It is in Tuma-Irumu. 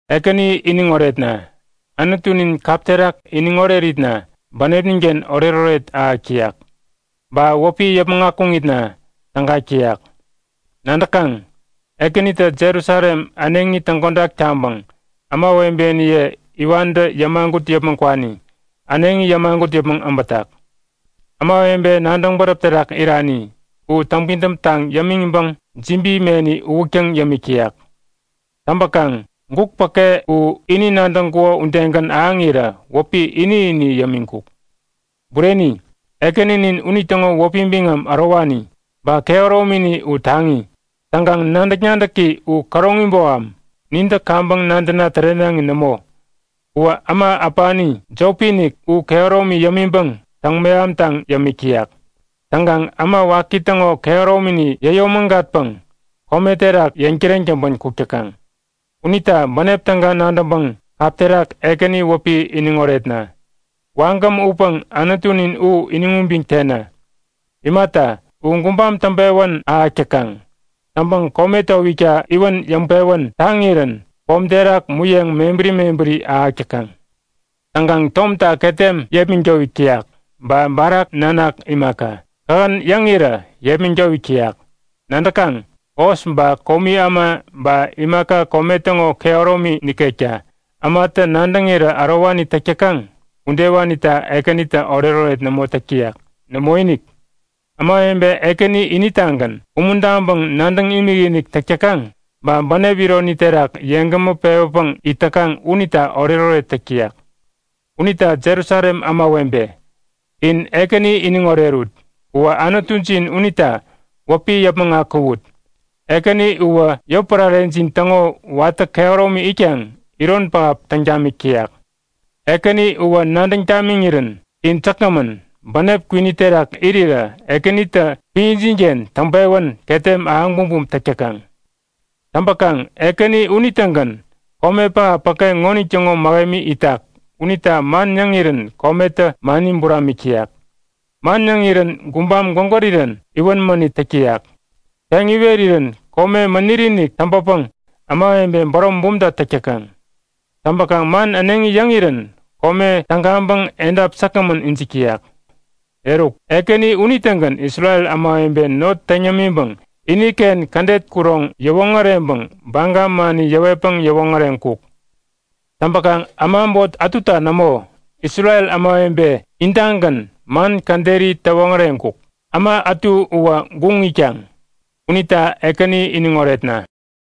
Ekäni iniŋ oretna! Anutunin kap terak iniŋ oreritna bänepninken oretoret ahäk täyak, ba wäpi yäpmäŋ akuŋitna tägak täyak. Nadäkaŋ? Ekänitä Jerusalem äneŋi täŋkodak taŋpäŋ ämawebeniye iwantä yämagut yäpmäŋ kwani äneŋi yämagut yäpmäŋ abätak. Ämawebe nadäŋ bäräp terak irani u täŋpidäm taŋ yämiŋpäŋ jibi meni uwäktäŋ yämik täyak. Täŋpäkaŋ guk päke u ini nadäŋkuko udegän ahäŋirä wäpi ini-ini yämiŋkuk. Bureni, Ekäninin unitäŋo wäpi biŋam ärowani, ba kehäromini u taŋi. Täŋkaŋ nadäk-nadäki u käroŋi boham, nintä kaŋpäŋ nadäna tärenaŋi nämo. Uwä äma äpani jopi-inik u kehäromi yämiŋpäŋ täŋ-mehamtaŋ yämik täyak. Täŋkaŋ äma waki täŋo kehäromini yäyomägatpäŋ kome terak yeŋ täreŋ täŋpän kuk täkaŋ. Unita bänep täga nadäŋpäŋ kap terak Ekäni wäpi iniŋ oretna! Wagäm utpäŋ Anutunin u iniŋ ubiŋ tena. Imata, u gubam täŋpewän ahäk täkaŋ. Täŋpäŋ kome towikta iwän yäŋpewän taŋirän pom terak muyeŋ mebäri mebäri ahäk täkaŋ. Täŋkaŋ tomta ketem yepmäŋ towik täyak. Ba barak nanak imaka, kähän yäŋirä yepmäŋ towik täyak. Nadäkaŋ? Hos ba komi äma ba imaka kome täŋo kehäromi nikekta ämatä nadäŋirä ärowani täk täkaŋ udewanita Ekänitä oretoret nämo täk täyak. Nämoinik! Ämawebe Ekäni initagän umuntaŋpäŋ nadäŋ imikinik täk täkaŋ, ba bänep ironi terak yeŋgämä pewäpäŋ it täkaŋ unita oretoret täk täyak. Unita Jerusalem ämawebe, in Ekäni iniŋ orerut. Uwä Anutujin unita wäpi yäpmäŋ akuwut. Ekäni uwä yotpärarejin täŋo watä kehäromi itkaŋ iron pähap täŋ tamik täyak. Ekäni uwä nadäŋ tamiŋirän in säkgämän, bänep kwini terak irirä Ekänitä epänjinken täŋpewän ketem ahäŋ bumbum täk täkaŋ. Täŋpäkaŋ Ekäni unitägän kome pähap päke ŋonitäŋo mähemi itak unita man yäŋirän kometä mani buramik täyak. Man yäŋirän gubam gwägärirän iwän mänit täk täyak. Peŋ iwerirän kome mäniri-inik täŋpäpäŋ ämawebe bärom bumta täk täkaŋ. Täŋpäkaŋ man äneŋi yäŋirän kome tägaŋpäŋ edap säkgämän ijik täyak. Eruk, Ekäni unitägän Isrel ämawebe not täŋ yämiŋpäŋ iniken kädet kuroŋ yäwoŋäreŋpäŋ baga mani yäwetpäŋ yäwoŋäreŋkuk. Täŋpäkaŋ äma äbot ätuta nämo, Isrel ämawebe intagän man käderi täwoŋäreŋkuk, äma ätu uwä guŋ itkaŋ. Unita Ekäni iniŋ oretna!